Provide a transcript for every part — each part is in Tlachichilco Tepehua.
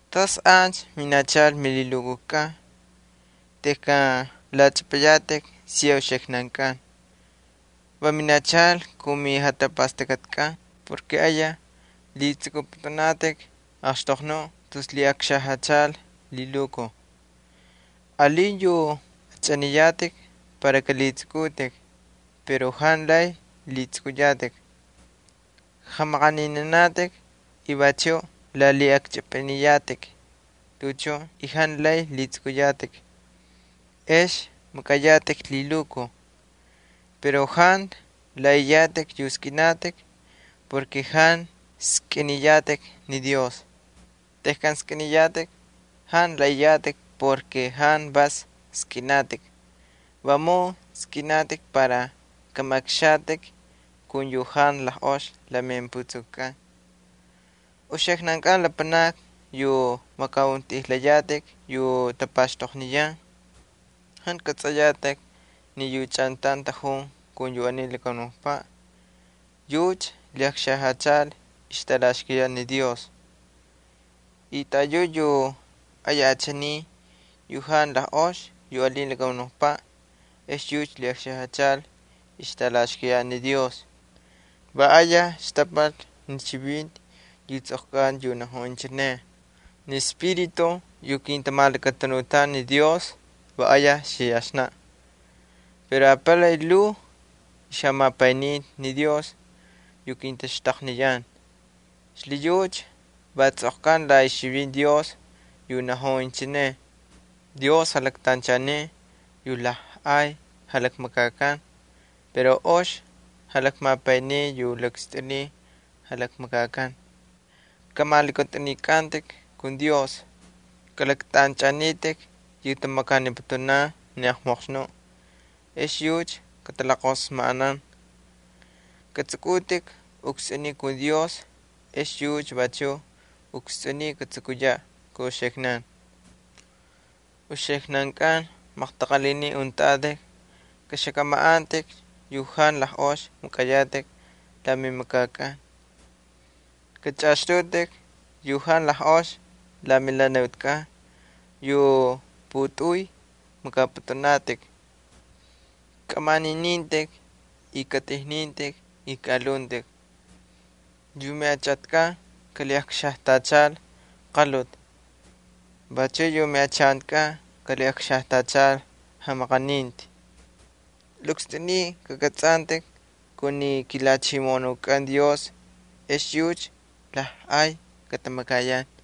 ¿Tas ancha minachal milhilukujkꞌan tejkan lachꞌapꞌayatꞌik siya uxiknankꞌan? Va minachal kun mijatapastakꞌatikꞌan porke ayaj lhitsꞌukꞌupꞌutꞌunatꞌik axtoqnuꞌ tus lhiꞌakxajyachal lhilukuj. Alin yu achꞌaniyatꞌik para kꞌalhitsꞌukꞌutꞌik pero jantu lay lhitsꞌukꞌuyatꞌik. Jamaꞌaninanatꞌik y vachu lalhiꞌakchꞌipꞌiniyatꞌik tuꞌuchun y jantu lay lhitsꞌukꞌuyatꞌik. Ex makꞌayatꞌik lhilukuj. Pero jantu laꞌaꞌiyatꞌik yu skꞌinatꞌik porke jantu skꞌiniyatꞌik ni Dios. Tejkan skꞌiniyatꞌik jantu laꞌaꞌiyatꞌik porke jantu vas skꞌinatꞌik, vamun skꞌinatꞌik para kꞌamaꞌaqxatꞌik kun yu jantu lajꞌox la mimputsukukꞌan. Uxiknan lapanakni yu makꞌauntꞌijlayatꞌik yu tapaxtoqniyan, ¿jantu kꞌatsꞌayatꞌik ni yu chꞌantaun tꞌajun kun yu aniy lakamunukpaꞌ yucha va ixtꞌalaxkayaꞌ ni Dios? Y taꞌayuꞌ yu ayaj achaniy yu jantu lajꞌox yu alin lakamunukpaꞌ ex yucha lhiꞌakxajyachal ixtꞌalaxkayaꞌ ni Dios. Va ayaj xtapal ni chivinti yu tsꞌoqkanta yu najun inchineꞌ: “Ni espíritu yu kintamalakatanutan ni Dios va ayaj xiyaxnaꞌ.” Pero apalay lhuu ixjamapayninti ni Dios yu kintaxtaqniyan. Xlhiyucha va tsꞌoqkanta la ixchivinti Dios, va najun inchineꞌ: Dios jalaktanchaniy yu lajꞌay jalakmakakan pero ox jalakmapayniy yu lakstꞌuniy jalakmakakan. Kꞌamalakꞌatꞌunikꞌantꞌik kun Dios. Kꞌalaktꞌanchꞌanitꞌik yu tamakaniputunan ni aqmoqxnuꞌ ex yucha katalajqosmajꞌanan. Katsꞌukꞌutꞌik ukstsꞌuniy kun Dios ex yucha vachuꞌ ukstsꞌuniy katsukuyaꞌ kun uxiknankꞌan. Uxiknankꞌan maqtaqalhinin untꞌatꞌik, kꞌaxakꞌamaꞌantꞌikcha yu jantu ox makꞌayatꞌik la mimakakꞌan. Kachꞌaꞌaxtꞌutꞌik yu jantu ox la melhanutkꞌan yu putꞌuy makꞌapꞌutꞌunatꞌik. Kꞌamaꞌaninitꞌik y katꞌijnintꞌik y kaꞌalhuntꞌik. Yu miꞌachatkꞌan kalhiꞌakxajtachal qalhuti vachuꞌ yu miꞌachantikꞌan kalhiꞌakxajtachal jamaqaninti. Lakstꞌuniy kakꞌatsꞌantꞌik kun ni kiJalhachimoꞌonukꞌan Dios ex yucha lajꞌay katamakayan.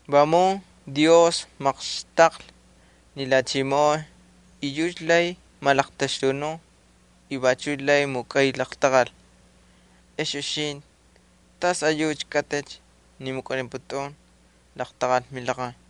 Vamun Dios maqxtaqlhi ni lhachimoꞌon y yucha lay malaqtaxtunun y vachu lay mukꞌay laqtaqal. Ex uxintꞌi, ¿tas ayucha kꞌatꞌicha ni mukꞌaniputun laqtaqal milaqaj?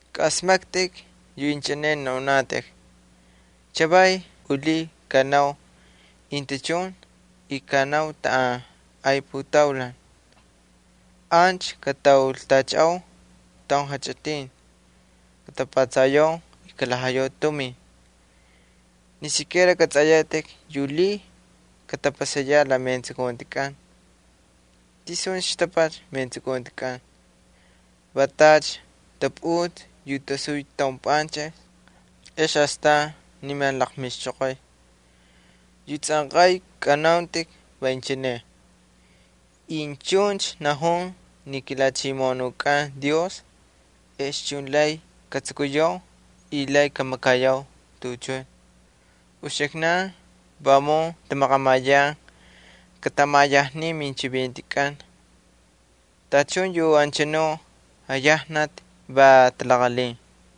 Kꞌaꞌasmaktꞌik yu inchineꞌ naunatꞌik: “Chavaycha u lhiy kꞌanau intachun y kꞌanau taꞌan ay putaulan. Ancha kataultachaꞌau taun jachꞌitin, katapatsayau y kalhajayau tumin.” Jantu kꞌatsꞌayatꞌik yu lhiy katapasayaꞌ la metsukuntikꞌan. ¿Tisuncha xtapal metsukuntikꞌan? Va tacha taputsꞌi yu tasuy taun panchꞌix ex astan niman laqmixchoqoy. Yu tsꞌanqay kꞌanauntꞌik va inchineꞌ: “Incha chuncha maqamay ni kiJalhachimoꞌonukꞌan Dios, ex chun lay katsukuyau y lay kamakayau tuꞌuchun.” Uxiknan vamun tamaqamayan katꞌamaꞌayajnin minchivintikꞌan. Tachun anchanu jaꞌayajnati va talaqalhin.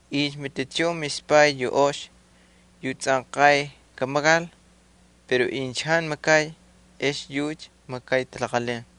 Incha matichun mispay yu ox yu tsꞌanqay kamakal pero incha jantu makay, ex yucha makay talaqalhin.